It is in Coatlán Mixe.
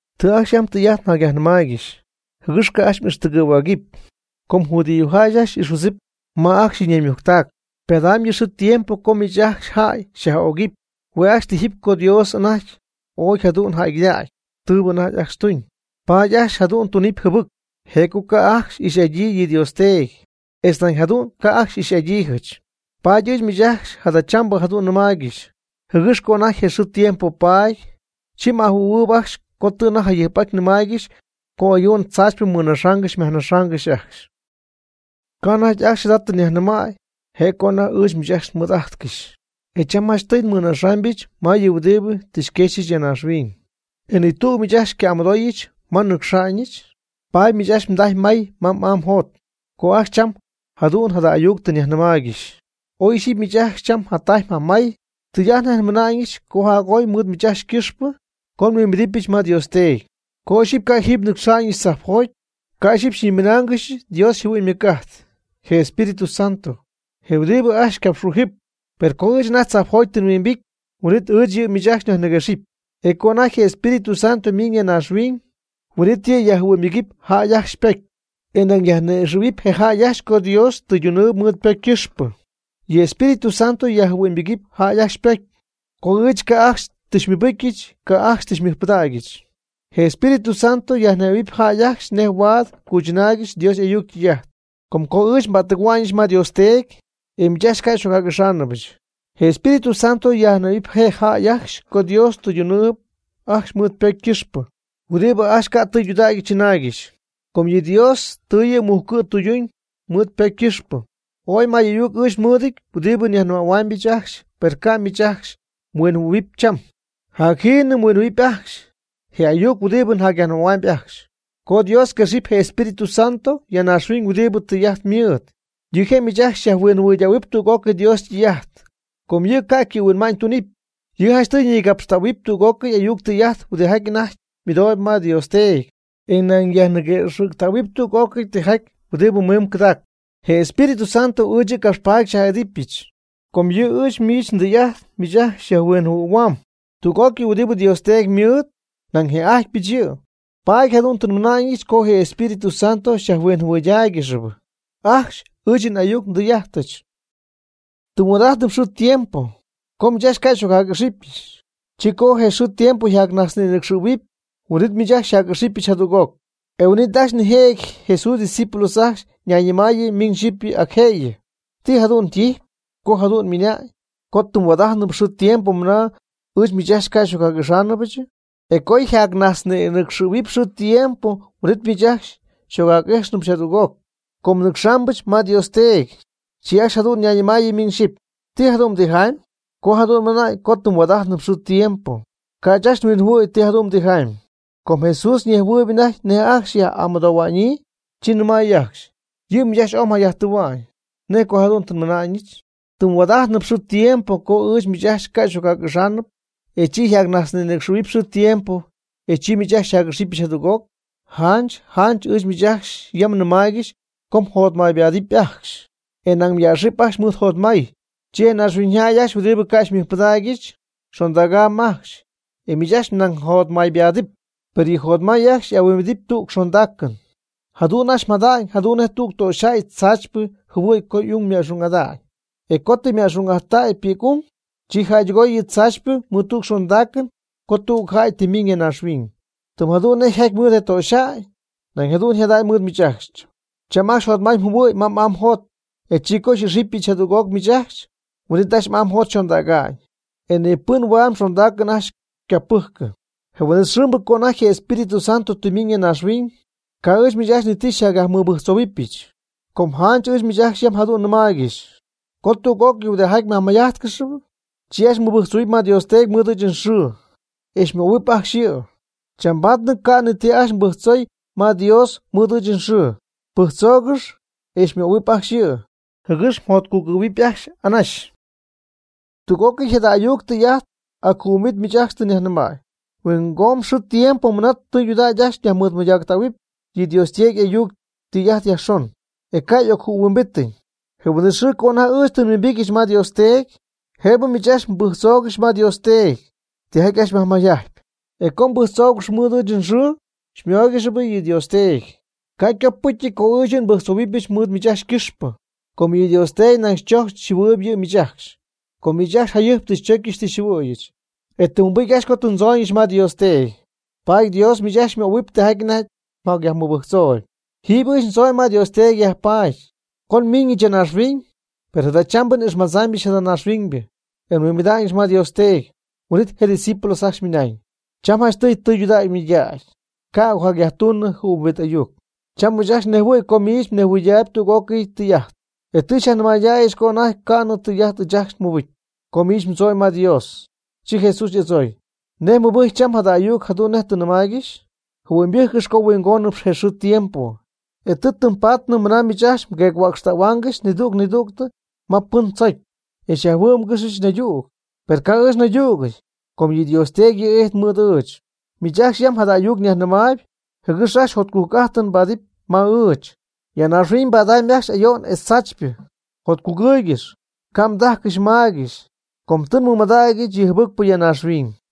Tɨ ajcxy yam tɨy'ajt njacyajnɨmaaygɨxy, jɨgɨx ca' ajcxy m'ixtɨgɨ̈huägɨpy. Com judíojäy ajcxy xy'ixhuidzɨpy ajcxy ma ajcxy yɨ' ñaymujctac. Ypadaamy yɨ xɨɨ tiempo co miich ajcxy jäy xyaj'ögɨpy, hue' ajcxy tijɨpy co Dios anajty ooy jadu'n jäygɨdägy tɨɨbɨ anajty ajcxy tuñ. Paady ajcxy jadu'n xytunɨpy jɨbɨc, je' co ajcxy ca' ixy'adyii yɨ Dios Teedy, etz nañ jadu'n ca' xy'ixy'adyiijɨch. Paady ɨɨch miich ajcxy jadachambɨ jadu'n nnɨmaaygɨxy, jɨgɨx co anajty je xɨɨ tiempo paady, chi m'ajɨhuɨ̈huɨɨyb ajcxy co tɨ anajty jayɨjp nnɨmaaygɨxy co ayo'n tzaachypɨ mmɨnaxa'ñ myajnaxa'ñ ajcxy. Ca' anajty ajcxy jada tɨ nyajnɨmäy mɨɨd jëgɨx nmɨɨd'ity ajcxy. E cham janchtɨy nnɨcxáanɨbɨch ma yɨ huɨdibɨ tɨ xyquexyɨch ya naaxhuiñ. E ni tüg miich ajcxy xyca'amɨdooyɨch: “¿Ma mnɨcxa'ñ?” Paady miich ajcxy mdajy mmay ma m'aa mjot, co ajcxy cham jadu'n jada ayuc tɨ nyajhuinjɨhuɨɨygɨxy. Oy ixyipy miich ajcxy cham mjatajy mjamay, tɨy'ajt nej nmɨna'ñɨch co jac'oy mɨɨd miich ajcxy ycɨxpɨ co nhuimbidɨpyɨch ma Dios Teedy. Co ixyipy ca' jiiby nnɨcxa'ñɨch tzajpjoty, ca' ixyipy xyñiminaangɨxy Dios yjɨhuɨ'ñ ymɨc'ajt, je Espíritu Santo, je huɨdibɨ ajcxy xycapxhuijɨp. Per co ɨɨch anajty tzajpjoty tɨ nhuimbity, huin'it ɨɨch yɨ' miich ajcxy nyajniguexɨpy. E co anajty je Espíritu Santo miiñ ya naaxhuiñ, huin'it yɨ' yajjɨhuɨ'ñybɨgɨpy jäy ajcxy ypocy. E nañ yajni'ixɨ̈huɨpy je jäy ajcxy co Dios tɨydunɨɨb mɨɨd ypocy ycɨxpɨ. Yɨ Espíritu Santo yajjɨhuɨ'ñybɨgɨpy jäy ajcxy ypocy, co ɨɨch ca' ajcxy tɨ xymɨbɨcy ca' ajcxy tɨ xymɨjpɨdägyɨch. Je Espíritu Santo yajnejhuɨ̈huɨpy jäy ajcxy nej huaad cuychɨnaaygɨxy Dios y'ayuc ytɨy'ajt. Com co ɨɨch nba'ttɨgɨ̈hua'ñɨch ma Dios Teedy, e miich ajcxy ca' xy'ocjac'íjxnɨbɨch. Je Espíritu Santo yajhuinjɨhuɨ̈huɨp je jäy ajcxy co Dios tɨydunɨɨb ajcxy mɨɨd ypocy ycɨxpɨ huɨdibɨ ajcxy ca' tɨydudägy chɨnaaygɨxy. Com yɨ Dios tɨ yɨ' mujcu' tɨyduñ mɨɨd ypocy ycɨxpɨ. Ooy may ayuc ɨɨch nmɨɨdɨty huɨdibɨ njayajnɨmähuaamyɨch ajcxy per ca' miich ajcxy mhuinjɨhuɨ̈huɨpy cham. Jacjiinɨ mhuinjɨhuɨ̈huɨpy ajcxy je ayuc huɨdibɨ njayajnɨmähuamy ajcxy, co Dios quexɨpy je Espíritu Santo ya naaxhuiñ huɨdibɨ tɨy'ajt mɨɨd. Yɨ' je' miich ajcxy xyajhuinjɨhuɨydähuɨpy tüg'ócɨy Dios ytɨy'ajt. Com yɨ' ca' ycɨ'mhuinma'ñ tunɨpy. Yɨ' janchtɨy ñigapxtähuɨpy tüg'ócɨy ayuc tɨy'ajt huɨdijaty anajty ymɨdooyb ma Dios Teedy, e nañ yajniguëxɨ̈ctähuɨpy tüg'ócɨy tɨy'ajt huɨdibɨ mimb cɨdaacp. Je Espíritu Santo ɨɨch yɨ' capxpaady xyaj'idɨpyɨch, com yɨ' ɨɨch ndɨy'ajt miich ajcxy xyajhuinjɨhuɨ̈huaam. Tüg'ócɨy huɨdibɨ Dios Teedy ymɨɨd, nañ një'ajtypɨch yɨ', paady jadu'n tɨ nmɨna'ñɨch co je Espíritu Santo xyajhuinjɨhuɨydáaygɨxɨpy ajcxy ɨɨch yɨ n'ayuc yɨ ndɨy'ajtɨch. Tɨm huaad'ajtp xɨɨ tiempo, co ɨɨch miich ajcxy ca' xy'ocjac'ijxɨp. Chi co xɨɨ tiempo yjacnajtznïnɨcxɨ̈huɨp, huin'it ɨɨch miich ajcxy xyjac'ixɨpy jadüg'oc. E huin'it ajcxy nijëjɨty Jesús ydiscípulos ajcxy ñayñɨmaayɨ miñ xyɨpy ac jëyɨ: ―¿Ti jadu'n ytijyp? Co jadu'n ymɨna'ñ, co tɨm huaad'ajtnɨp xɨɨ tiempo mɨna ɨɨch miich ajcxy ca' xy'ocjac'íjxnɨbyɨch, e co yjacnajtznïnɨcxɨ̈huɨp xɨɨ tiempo, huin'it miich ajcxy xyjac'ixɨpyɨch jadüg'oc, com nnɨcxaamɨch ma Dios Teedy. Chi ajcxy jadu'n ñayñɨmaayɨ miñ xyɨpy: ―¿Ti jadu'n ytijamy? Co jadu'n ymɨna'ñ co tɨm huaad'ajtnɨp xɨɨ tiempo. Ca' ɨɨch ajt nhuinjɨhuɨɨyɨm ti jadu'n ytijamy. Com Jesús ñejhuɨɨyb anajty nej ajcxy yja'amɨdoohua'ñyii, chi nɨmay ajcxy: ―Yɨ' miich ajcxy ooy mjayajtɨɨhua'ñ. ¿Nej co jadu'n tɨ nmɨna'ñɨch? Tɨm huaad'ajtnɨp xɨɨ tiempo co ɨɨch miich ajcxy ca' xy'ocjac'ijxnɨpy. E chi yjacnajtznïnɨcxɨ̈huɨp xɨɨ tiempo, e chi miich ajcxy xyjac'ixɨpyɨch jadüg'oc. Janch janch ɨɨch miich yam nnɨmaaygɨxy co mjotmaybaadɨp ajcxy, e nañ myäxɨp ajcxy mɨɨd jotmay. Chi je naaxhuiñyjäy ajcxy huɨdibɨ ca' xymɨjpɨdägyɨch, xondägam ajcxy, e miich ajcxy nañ mjotmaybaadɨp. Per yɨ mjotmay ajcxy ahuimbidɨpy tüg xondaacɨn. Jadu'n ajcxy mjada'ñ jadu'n nej tüg töxyjäy tzaachypɨ jɨhuɨ̈y co y'ung yma'xung'ada'ñ. E co tɨ yma'xung'aty ypi'c'ung, chi jäydɨgoy yɨ tzaachypɨ mɨɨd xondaacɨn co tüg jäy tɨ ymiiñ ya naaxhuiñ. Tɨm jadu'n nej yjaty mɨɨd je töxyjäy, nañ jadu'n yjada'ñ mɨɨd miich ajcxy. Cham ajcxy jotmay mjɨhuɨ̈y ma m'aa mjot, e chi co xy'ixɨpyɨch jadüg'oc miich ajcxy, huin'it ajcxy m'aa mjot yxondäga'ñ. E ni pɨn huaad mxondaacɨn ajcxy xycapɨjcɨpy. Je huin'it xɨɨmbɨ (co anajty je Espíritu Santo tɨ ymiiñ ya naaxhuiñ) ca' ɨɨch miich ajcxy ni ti xyjacyajmɨbɨjctzohuɨpyɨch, com janch ɨɨch miich ajcxy yam jadu'n nɨmaaygɨxy co tüg'ócɨy huɨdijaty myajmayjajtcɨxyp, chi ajcxy mbɨjctzohuɨpy ma Dios Teedy mɨɨd ɨɨch nxɨɨ, e xymöhuɨpy ajcxy yɨ'. Chambaadnɨ ca'nɨ ni ti ajcxy mbɨjctzoy ma Dios mɨɨd ɨɨch nxɨɨ. Pɨjctzoogɨx, e xymöhuɨpy ajcxy yɨ', jɨgɨx mjotcugɨ̈huɨp ajcxy anaxy. Tüg'ócɨy jada ayuc tɨy'ajt ac jɨɨhuimbit miich ajcxy tɨ nyajnɨmäy. Huingomb xɨɨ tiempo mɨna tɨydudägy ajcxy nyajmɨɨdmɨydactähuɨpy yɨ Dios Teedy y'ayuc ytɨy'ajt yajxon, e ca' y'ocjɨɨhuimbitiñ. Je huin'it xɨɨ co anajty ɨɨch tɨ nhuimbityɨch ma Dios Teedy, jëbɨ miich ajcxy mbɨjctzoogɨxy ma Dios Teedy tijaty ajcxy myajmayjajtyp. Co tɨ mbɨjctzóogɨxɨpy mɨɨd ɨɨch nxɨɨ, xymóoygɨxɨpy yɨ' Dios Teedy. Ca' ycopɨcyɨty co ɨɨch yɨ' nmɨbɨjctzohuɨpy mɨɨd miich ajcxy ycɨxpɨ. Com yɨ Dios Teedy nañ xychojcp xyjɨhuɨɨyb yɨ' miich ajcxy. Com miich ajcxy jayɨjp tɨ xychocyɨch tɨ xyjɨhuɨ̈yɨch, e tɨ mmɨbɨcy ajcxy co tɨ ndzooñɨch ma Dios Teedy, paady Dios miich ajcxy xymöhuɨpy tijaty anajty myajmɨbɨjctzooyb. Jiiby ɨɨch ndzooñ ma Dios Teedy yajpaady, co nmiiñɨch ya naaxhuiñ, per jadachambɨ n'ixmájtznɨbyɨch jada naaxhuiñybɨ, e nhuimbijtnɨch ma Dios Teedy. Huin'it je' ydiscípulos ajcxy ymɨnañ: ―Cham janchtɨy tudägy mɨydägy, ca' m'ocyajtuunɨ jɨɨhuimbit ayuc. Cham ɨɨch ajcxy nnejhuɨ̈y co miich mnejhuɨyday tüg'ócɨy tɨy'ajt. E tɨ xyajnɨmaydäyɨch co anajty ca' ti tɨy'ajt ɨɨch ajcxy nmɨbɨcy co miich mdzooñ ma Dios. Chi Jesús y'adzooy: ―¿Nej mmɨbɨjcyp cham jada ayuc jadu'n nej tɨ nnɨmáaygɨxyɨ? Jɨhuɨ'ñybɨjccɨx co huingonɨp je xɨɨ tiempo, e tɨ tɨm paady mɨna miich ajcxy mgueec-huäcxtáaygɨxɨpy nidüg nidüg ma pɨn tɨmdzocy, e xyajhuɨ́'mgɨxɨch naydüg. Per ca'p ɨɨch nnaydügɨty, com yɨ Dios Teedy yɨ' ijtp mɨɨd ɨɨch. Miich ajcxy yam jada ayuc nyajnɨmaayb, jɨgɨx ajcxy jotcujc'ajtɨn mbaadɨp ma ɨɨch. Ya naaxhuiñ mbadamy ajcxy ayo'n etz tzaachypɨ. Jotcugɨɨygɨx, ca' mdajcɨxy maygɨxy, com tɨ nmɨmadägyɨch yɨ jɨbɨcpɨ ya naaxhuiñ.